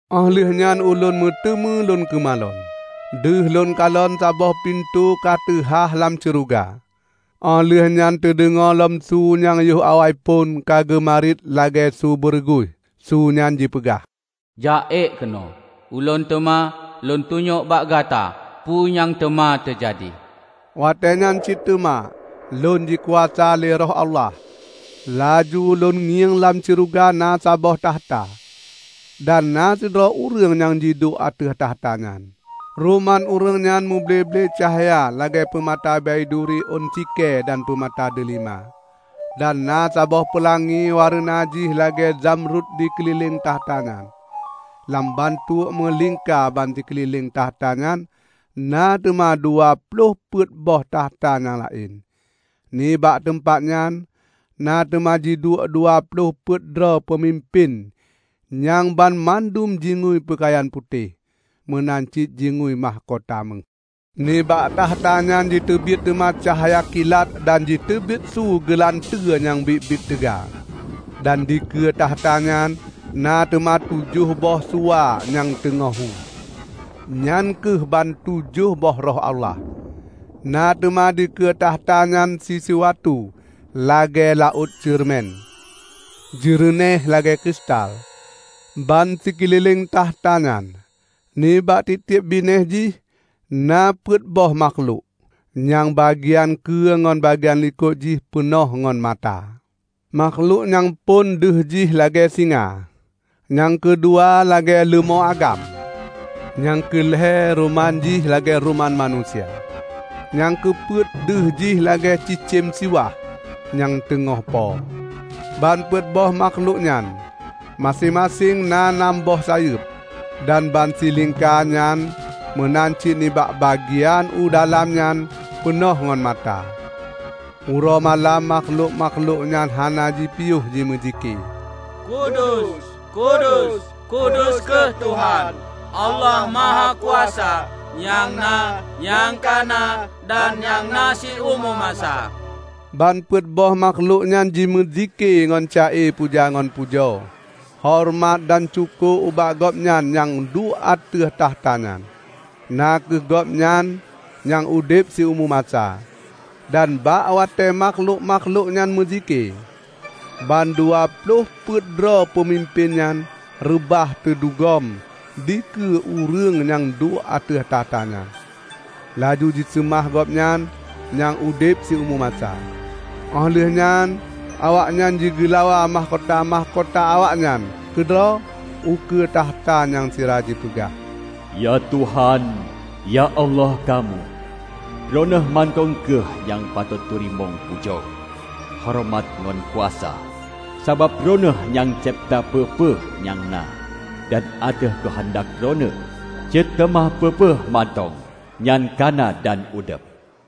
Óh lheueh nyan ulôn meuteumé lôn keumalon. Deuh lôn kalon saboh pintoe ka teuhah lam syeuruga. Óh lheueh nyan teudeungoe lom su nyang yoh awai phon ka geumariet lagée su beureuguih. Su nyan jipeugah, "Jak ék keunoe. Ulôn teuma lôn tunyok bak gata peue nyang teuma teujadi." Watée nyan cit teuma lôn jikuasa lé Roh Allah. Laju lôn ngieng lam syeuruga na saboh takhta, dan na sidroe ureuëng jiduek ateueh takhta nyan. Ruman ureuëng nyan muble-ble cahya lagée peumata baiduri ôn sikée dan peumata deulima. Dan na saboh peulangi wareuna jih lagée zamrut jikeulileng takhta nyan. Lam bantuek meulingka bansikeulileng takhta nyan na teuma dua ploh peuet boh takhta nyang laén. Nibak teumpat nyan na teuma jiduek dua ploh peuet droe peumimpén nyang banmandum jingui peukayan putéh, meunan cit jingui mahkota méuh. Nibak takhta nyan jiteubiet teuma cahya kilat dan jiteubiet su geulanteue nyang biet-biet teuga. Dan dikeue takhta nyan na teuma tujoh boh suwa nyang teungoh hu; nyan kheueh bantujoh boh Roh Allah. Na teuma dikeue takhta nyan sisuatu lagée laôt ceureumen, jeureunéh lagée kristal. Ban sikeulileng takhta nyan, nibak tieb-tieb binéh jih, na peuet boh makhlok, nyang bagian keue ngon bagian likot jih peunoh ngon mata. Makhlok nyang phon deuh jih lagée singa. Nyang keudua lagée leumô agam. Nyang keu lhée ruman jih lagée ruman manusia. Nyang keu peuet, deuh jih lagée cicém siwah nyang teungoh po. Ban peuet boh makhlok nyan, maséng-maséng na nam boh sayeueb, dan bansilingka nyan meunan cit nibak bagian u dalam nyan peunoh ngon mata. Uroe malam makhlok-makhlok nyan hana jipiôh jimeuzikée, "Kudus, kudus, kudus kheueh Tuhan, Allah Mahakuasa; nyang na, nyang ka na, dan nyang na siumu masa." Ban peuet boh makhlok nyan jimeuzikée ngon ca-e puja ngon pujo, horeumat dan syukoe ubak Gobnyan nyang duek ateueh takhta nyan, na kheueh Gobnyan nyang udeb siumu masa. Dan bak watée makhlok-makhlok nyan meuzike, ban dua ploh peuet droe peumimpén nyan reubah teudugom dikeue ureuëng nyang duek ateueh takhta nyan, laju jiseumah Gobnyan nyang udeb siumu masa. Óh lheueh nyan awaknyan jigeulawa mahkota-mahkota awaknyan keudroe ukeue takhta nyan sira jipeugah, "Ya Tuhan, ya Allah kamoe! Droeneueh mantong kheueh nyang patot teurimong pujo, horeumat ngon kuasa. Sabab droeneueh nyang cebta peue-peue nyang na, dan ateueh keuheundak Droeneueh cit teuma peue-peue mantong nyan ka na dan udeb."